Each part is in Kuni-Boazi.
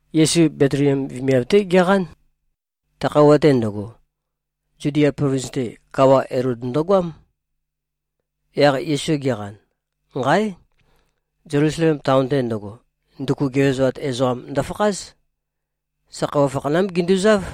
Yesu Betliem vemiav-té geqán. Ta khøuwa-te ndøgo, Zudia plovins-te, kawa, Elod ndøgoám. Yaq Yesu geqan, nqáe! Zelusalem taon-te ndøgo, nduku gevezoat ezoqam ndøfakház. Sa khøuwa fakhanám ginduzáv.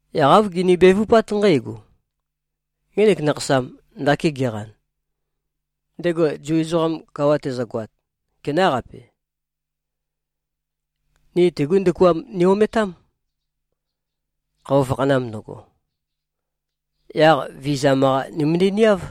Yaq āv gini-bevupát nqǽgo, “Ngenek nakhasam, ndaki geqan, ndego Zu ezoqam kawa tezøgoat, kenáqape? Ni tegú ndukuam ni-ometám, khøuwa fakhanam ndøgo. Yaq vizam-qa nimøndæ-niáv.”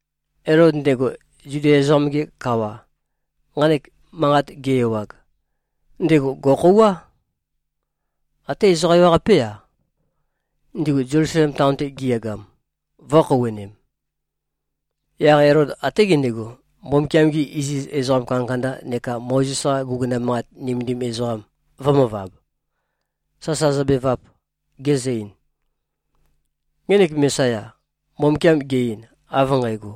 Elod ndego, Zudia ezoqam-ge kawa, nqanek manqat ge-ewag, ndego gò꞉khouwá. Até ezoqa ewaqapé-a, ndigu Zelusalem taon-te giyagam, vō꞉khouwønem. Yaq Elod até gendego, Mbumbukiam-gi iziz ezoqa kandakanda neka Mozes-qa guguna manqat nømendim ezoqam vø̄møvab, sasa zøbevap, gezø-ein, “Ngenek Mesaya, Mbumbukiam ge꞉-ein, av nqægo,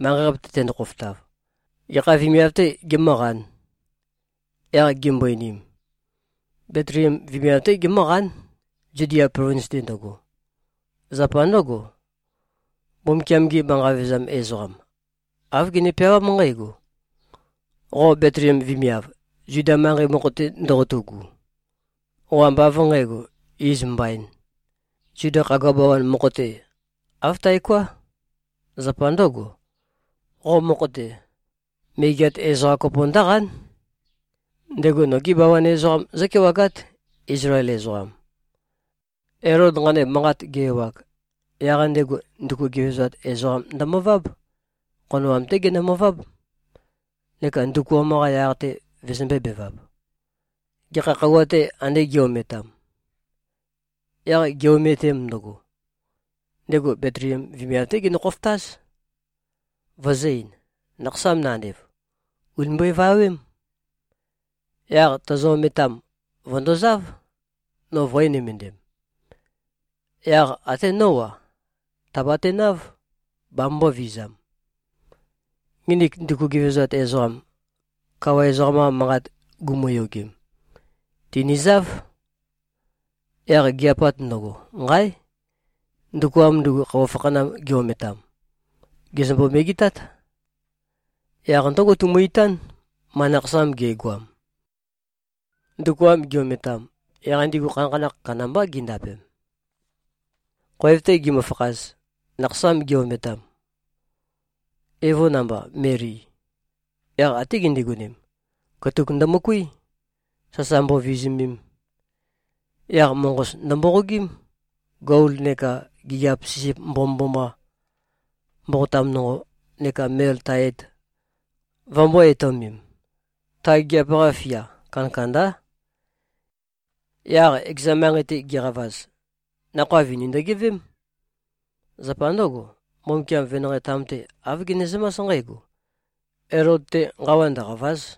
manqei-qape-te tendo-khofotav, gekha vemiav-tē gemǿqān?” Yaq gimbo-einim, “Betliem vemiav-té gemǿqán, Zudia plovins-te ndøgo. Zapa ndǿgo, Mbumbukiam-ge manqa vevezam ezoqam, āv gene-peawám nqǽgo, ‘Qo Betliem vemiav, Zuda manqei mokho-te ndoqotu꞉gu, qo ambá av nqǣgo, iz mbaīn, Zuda khagua bawan mokho-te. Āv taoká. Zapa ndǿgo, qo mokho-te, megeat ezoqam kopo ndǿqán. Ndego nogi bawan ezoqam zǿkewagát, Izlael ezoqam.’” Elod nqanek manqat ge-ewag, yaq ndego nduku gevezoat ezoqam ndømøváb. Khonoam-té genømøváb, neka ndukuam-qa yaq-te vøzømbē-bevap, gekha khøuwa-tê, ande gi꞉-ometam. Yaq gi꞉-ometem ndøgo, ndego Betliem vemiav-té genø-khofotáz, vøzø̄-ein, “Nakhasam nandev, ùni mbøevawém. Yaq tozo-ometam, vø̀ndozáv, no vø̄e-nømøndem. Yaq até nó-a, tàbatenáv, bamømbō-vizam.” Nginik nduku gevezoat ezoqam, kawa ezoqam-qa manqat gumuyogem, tìnizáv. Yaq gi꞉-apat ndøgo, nqáe! Ndukuam ndugu, khøuwa fakhanam gi-ometam, gèzømbo-megetát. Yaq ndǿgo, tumø-itán, ma nakhasam ge꞉goam. Ndukuam gi-ometam, yaq ndigu khanakhanakh kandambá gindapem. Khoev-te gimøfakhaz, nakhasam gi-ometam, evo namba, Meli, yaq até gindigonem, katuk ndømøkuí, sasa mbovizumem. Yaq moqos ndømboqogím, gol neka gigiap sisip mbomømboma, mboqotam nonqo, neka mel tae et, vømbō-etøomem. Ta gigiap-qa fia kandakandá. Yaq ekeza manqei-te giqavaz, nakhoa vini ndøgeveém. Zapa ndǿgo, Mbumbukiam venanqei-tam-te, āv genezømás nqǽgo, “Elod-te nqawa ndøqàva᷄z.”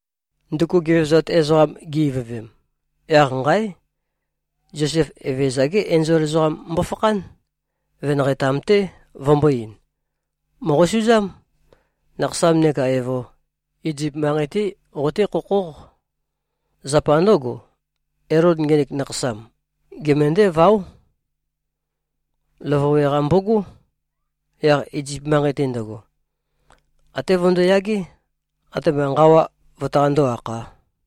Nduku gevezoat ezoqam gi-ivøvem, yaq nqáe! Zosef, Evezøza-gé enzol ezoqam mbofakhán, venanqei-tam-té, vømbō-ein, “Mòqosuzám. Nakhasam neka evo, Izip manqei-té qoté-khokhóq. Zapa ndǿgo, Elod ngenek nakhasam gemøndǽ-váo. Løvøwe-qa mbogó. Yaq Izip manqei-te ndøgo, até vøndoyagé, atema nqawa vøtaqandó-akhā.”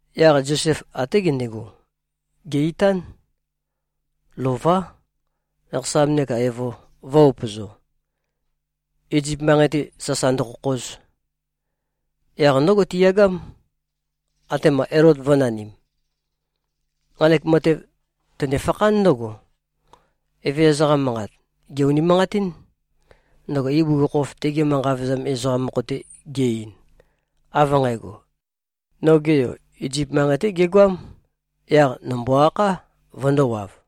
Yaq Zosef até gendego, gè-itán, lová, nakhasam neka evo vø̄-upøzo, Izip manqei-te sasa ndøkhokhoz. Yaq ndǿgo tiyagám, atema Elod vø̄nanim. Nqanek matev tønefakhán ndǿgo, Evezøza-qa manqat gè-unimanqatín, ndøgo ibugukhokhof tege manqa vevezam ezoqam mokho-te ge-ein, av nqægo, “Noge Yo, Izip manqei-té gegoám. Yaq nòmbo-akhá, vøndōwav.”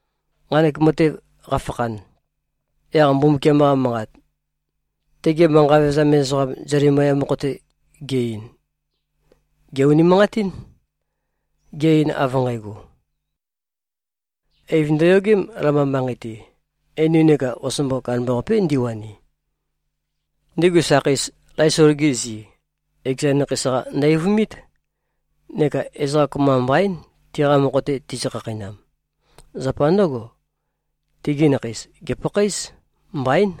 Nqanek matev qafakhan, yaq Mbumbukiam-qa Manqat, tege manqa vevezam ezoqam Zelemaya mokho-te ge-ein, gè-unimanqatín, ge-ein av nqægo, “Eiv ndøyogém, Lama manqei-te. Einu neka osombo kandambaqapé ndiwani. Ndigu sakheis, Laisol-gi zi, ekeza nakheis-qa ndø-eivumít, neka ezoqa kopømba mbaín, tiqa mokho-te tizø-khakheinam. Zapa ndǿgo, tigi nakheis gèpakhaéz. Mbaín.”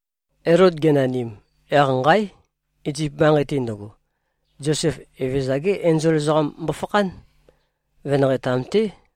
Elod ge꞉nanim, yaq nqáe! Izip manqei-te ndøgo, Zosef, Evezøza-ge enzol ezoqam mbofakhán, venanqei-tam-té,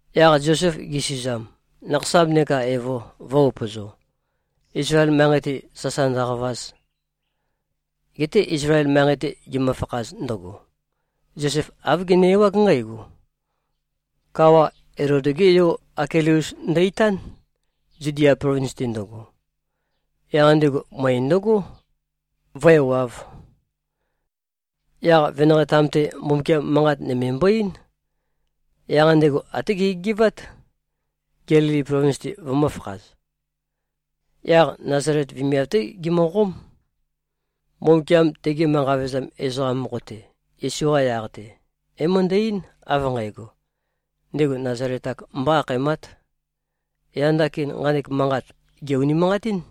Yaq Zosef gesuzam, nakhasam neka evo vø̄-upøzo, Izlael manqei-te sasa ndøqavaz. Geté Izlael manqei-te gimøfakhaz ndøgo, Zosef āv gene-ewág nqǽgo: Kawa, Elod-gé yo Akileus ndø-itán, Zudia plovins-te ndøgo. Yaq ndego møe ndøgó, vǿewāv. Yaq venanqei-tam-te, Mbumbukiam manqat nøme mbo-eín. Yaq ndego até gegegevát, Gelili plovins-te vømø̄fakhaz. Yaq Nazalet vemiav-té gimøqóm. Mbumbukiam tege manqa vevezam ezoqam mokho-te, Yesu-qa yaq-te, é-møndæ-eín, av nqægo, “Ndego Nazalet-ak mbó-akhaemát.” Yaq ndakin nqanek manqat gè-unimanqatín.